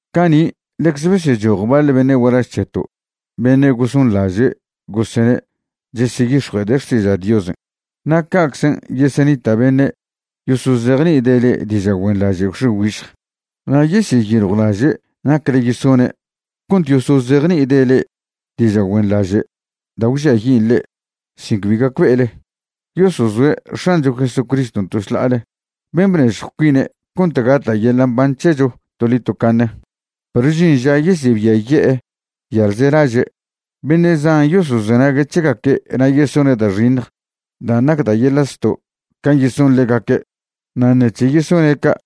Cani' ḻecze besechoj baḻ beṉe' gualaž c̱heto' beṉe' gosonḻaže' gosene' cheseyix̱jue'ede' xtiža' Diosen', na' ca'czen' yesenita' beṉe' yosozejni'ide' le'e diža' güenḻaže' gwx̱e güižj. Na' yeseyiljwlaže' nacle yesone' cont yosozejni'ide' le'e diža' güenḻaže' da' gwžiayin' le'e sin cbi gacbe'ele. Yosozoe' X̱ancho Jesucriston' to šḻa'ale, ben' bnežjw cuine' cont gata' yeḻa' mban c̱hecho toḻi tocaṉe. Perw žin ža yesebiaye'e yalzelaže'. Beṉe' zan yosozenague' c̱hegaque' na' yesone' da' xiṉj dan' nac da' yeḻa' zto' can' yeson ḻegaque'. Na' ṉec̱he yesone' ca',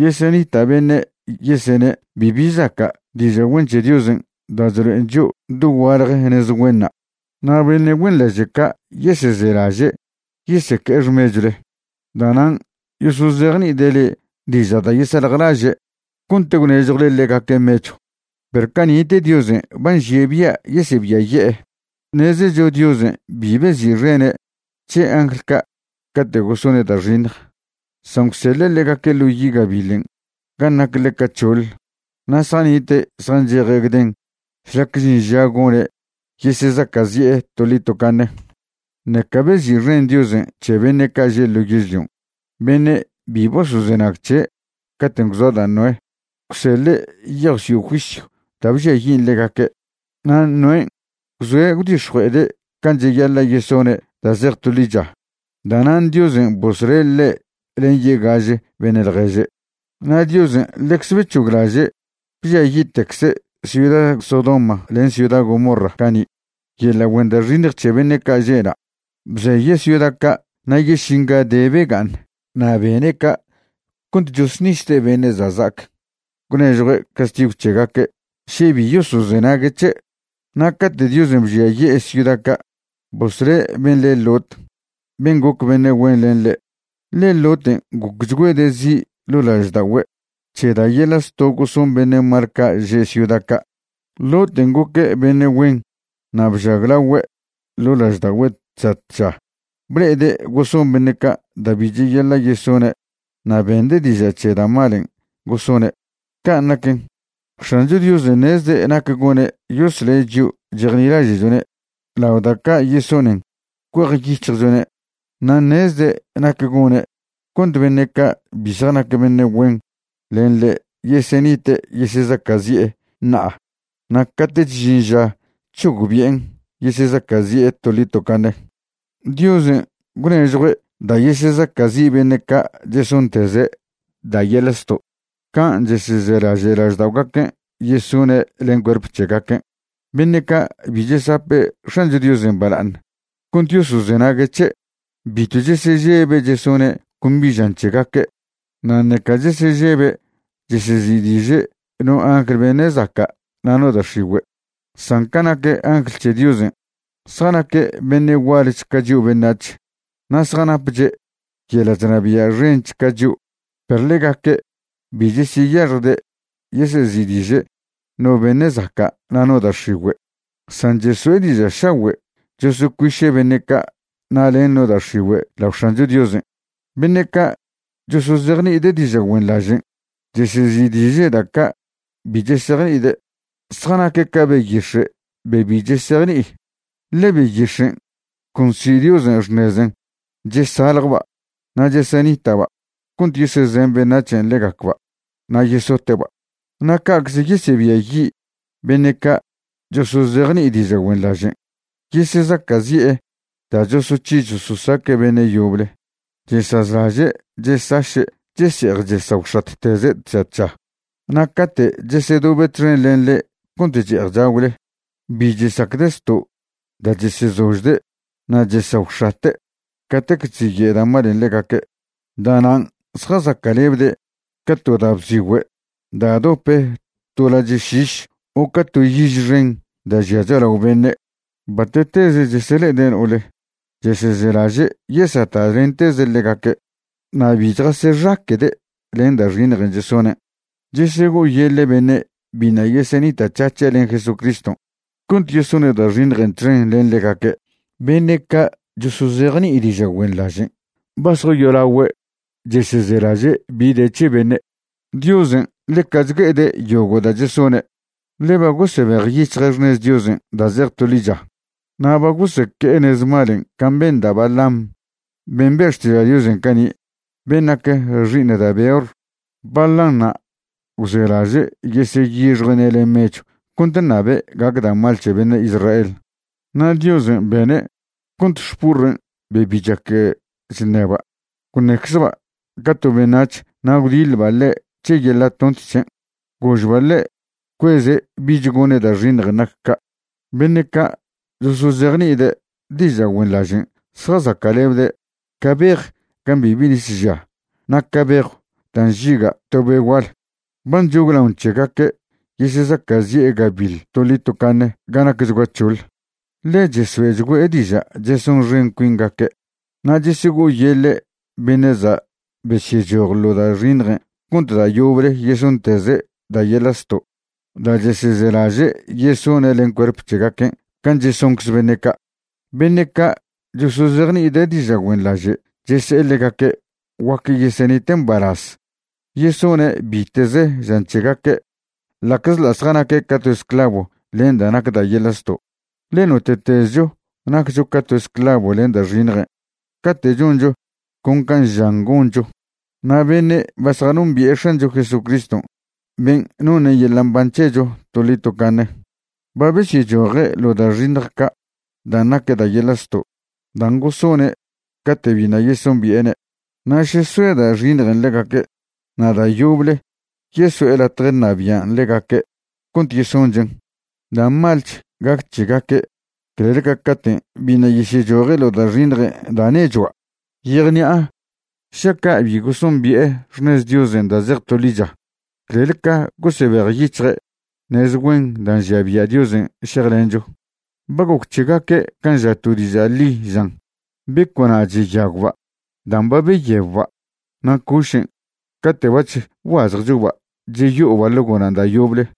yesenita' beṉe' yesene' bibi zaca' diža' güen c̱he Diosen' da' chlo'en chio' dogualje nez güenṉa'. Na' beṉe' güenḻaže' ca' yesezelaže' yeseque'e xmechwle. Da'nan' yosozejni'ide' le'e diža' da' yesaljlaže' cont gwnežjwle ḻegaque' mechw. Perw cani'te Diosen' ba nžie' bia' yesebiaye'e. Ṉezecho Diosen' bi bezi'xene' c̱he angl ca' cate' gosone' da' xiṉj, san gwseḻe' ḻegaque' ḻo yi' gabiḻen' gan' nac ḻeca c̱hoḻ, na' zjanite' zjancheje' gden šlac žin ža gone' yesezaca'zi'e toḻi tocaṉe. Ṉeca bezi'xen Diosen' c̱he beṉe' ca' že' ḻo yežlion' beṉe' bi bosozenag c̱he' caten' gwzoa da' Noé. Gwseḻe' yejw sio' juisyw da' bžiayin' ḻegaque'. Na' Noén' gwzoe' gwdix̱jue'ede' can' cheyaḻa' yesone' da' zej to ḻicha. Da'nan' Diosen' bosle' ḻe' len yegaže beṉe' ḻježe'. Na' Diosen' ḻecze bec̱hoglaže' bžiayi'tecze' ciuda Sodoma len ciuda Gomorra cani' yeḻa' güen da' xiṉj c̱he beṉe' ca' že'na'. Bzeye' ciuda ca' na' yešinga de bega'aṉ. Na' bene' ca' cont chosṉisde' beṉe' za' za'ac gwnežjue' castigw c̱hegaque' še bi yosozenague' c̱he'. Na' cate' Diosen' bžiaye'e ciuda ca', bosle' ben' le Lot ben' goc beṉe' güen len ḻe', ḻe Loten' gocchgüede' zi' ḻo' lažda'ogüe' c̱he da' yeḻa' zto' goson beṉe' mal ca' že' ciuda ca'. Loten' goque' beṉe' güen na' bžaglagüe' ḻo' lažda'ogüe' tža tža ble'ede' goson beṉe' ca' da' bi cheyaḻa' yesone' na' bende' diža' c̱he da' malen' gosone'. Can' naquen, X̱ancho Diosen' ṉezde' nac gone' yosle' chio' chejnilaže'chone' lao da' ca' yesonen cuejyic̱hjchone', na' ṉezde' nac gone' cont beṉe' ca' bi zjanac beṉe' güen len ḻe' yesenite' yesezaca'zi'e ṉa'a na' cate'ch žin ža c̱hogbi'en yesezaca'zi'e toḻi tocaṉe. Diosen' gwnežjwchgüe' da' yesezaca'zi' beṉe' ca' chesonteze' da' yeḻa' zto' can' chesezelaže' lažda'ogaquen' yesone' len cuerp c̱hegaquen'. Beṉe' ca' bi chesape' X̱ancho Diosen' bala'aṉ cont yosozenague' c̱he'. Bitw chesežebe' chesone' con bi žan c̱hegaque', na' ṉeca chesežebe' chesezi'diže' no angl beṉe' zaca' na' no da' x̱igüe'. San ca nac angl c̱he Diosen', zjanaque' beṉe' gualch ca chio' beṉac̱h na' zjanapche' yeḻa' chnabia' xench ca chio', perw ḻegaque' bi cheseyaxjde' yesezi'diže' no beṉe' zaca' na' no da' x̱igüe', san cheso'e diža' šagüe' chosocuiše' beṉe' ca' na' len no da' x̱igüe' lao X̱ancho Diosen'. Beṉe' ca' chosozejni'ide' diža' güenḻažen', chesezi'diže' da' ca' bi chesejni'ide'. Zjanaque' ca beyix̱e' be bi chesejni'i. Ḻe beyix̱en' con nsi' Diosen' xṉezen' chesaljba' na' chesenita'ba' cont yesezen beṉac̱hen' ḻegacba' na' yesote'ba'. Na' ca'cze yesebiayi' beṉe' ca' chosozejni'i diža' güenḻažen', yesezaca'zi'e da' chosoc̱hi chososaque' beṉe' yoble. Chesazlaže' chesaše' chese'ej chesagwx̱atteze' tža tža. Na' cate' chesedobe' txen len le'e cont che'ej chagwle, bi chesacde' zto' da' chesezožde' na' chesagwx̱ate' catec chziye' da' malen' ḻegaque'. Da'nan' zjazaca'lebde' ca to da' bzigüe' da' dope to ḻo lache' šiš o ca to yiž xen da' žia cho'alao beṉe'. Bate'teze chesele'ede' no'ole, chesezelaže' yesata'lenteze' ḻegaque', na' bi chjasexaque'de' len da' xiṉjen' chesonen'. Chesego'oyeḻe' beṉe' biṉa' yesenita'c̱hac̱he' len Jesucriston' cont yesone' da' xiṉjen' txen len ḻegaque'. Beṉe' ca' chosozejni'i diža' güenḻažen' ba zjayolagüe' chesezelaže' bi de c̱he beṉe'. Diosen' ḻeca chgue'ede' yogo' da' chesone'. Ḻe ba gosebejyic̱hje' xṉez Diosen' da' zej to ḻicha. Na' ba goseque'e nez malen' can' ben da' Balaam ben' be' xtiža' Diosen' cani', ben' nac xi'iṉ da' Beor. Balaanṉa' gwzelaže' yeseyixjue'ne' len mechw cont ṉabe' gac da' mal c̱he beṉe' Israel. Na' Diosen' bene' cont xpurren' be bi chac chṉeba' gwṉeczba' ca to beṉac̱h na' gwdiḻba' ḻe' c̱he yeḻa' tont c̱hen', gožba' ḻe' cueze' bich gone' da' xiṉjen' nac ca'. Beṉe' ca' chosozejni'ide' diža' güenḻažen' zjazaca'lebde' ca bej gan' bibi nis žia na' ca bejw da' nžiga' to be' gual. Ba nchoglaon c̱hegaque' yesezaca'zi'e gabiḻ toḻi tocaṉe ga nacchgua c̱hoḻ. Ḻe chesoe'chgüe' diža' chesonxen cuingaque' na' chesego'oyeḻe' beṉe' za' besyechoj ḻo da' xiṉjen' cont da' yoble yesonteze' da' yeḻa' zto' da' chesezelaže' yesone' len cuerp c̱hegaquen' can' chesoncze beṉe' ca'. Beṉe' ca' chosozejni'ide' diža' güenḻaže' chese'e ḻegaque' guac yesenite' mbalaz yesone' bite'ze žan c̱hegaque', ḻa'czḻa' zjanaque' ca to esclavo len da' nac da' yeḻa' zto'. Ḻe note'tezcho naccho ca to esclavo len da' xiṉjen' cate' choncho con can' žan goncho. Na' beṉe' ba zjanombi'e X̱ancho Jesucriston' ben' noṉe' yeḻa' mban c̱hecho toḻi tocaṉe, ba besyechoje' ḻo' da' xiṉj ca' dan' nac da' yeḻa' zto' dan' gosone' cate' biṉa' yesombi'ene', na' še soe da' xiṉjen' ḻegaque' na' da' yoble yeso'e latje ṉabian' ḻegaque' cont yesonchen', da' malch gac c̱hegaque' clel ca caten' biṉa' yesyechoje' ḻo da' xiṉjen' da' nechua'. Yejni'a šaca' bi gosombi'e xṉez Diosen' da' zej to ḻicha clel ca gosebejyic̱hje' nez güen da' nžia bia' Diosen' šejlencho. Ba goc c̱hegaque' can' ža to diža' ḻi žan: “Beco'na' cheyagwba' dan' ba beyebba' na' cošen' cate' bac̱h bguazjchoba' cheyo'oba' ḻo gonan' da' yoble.”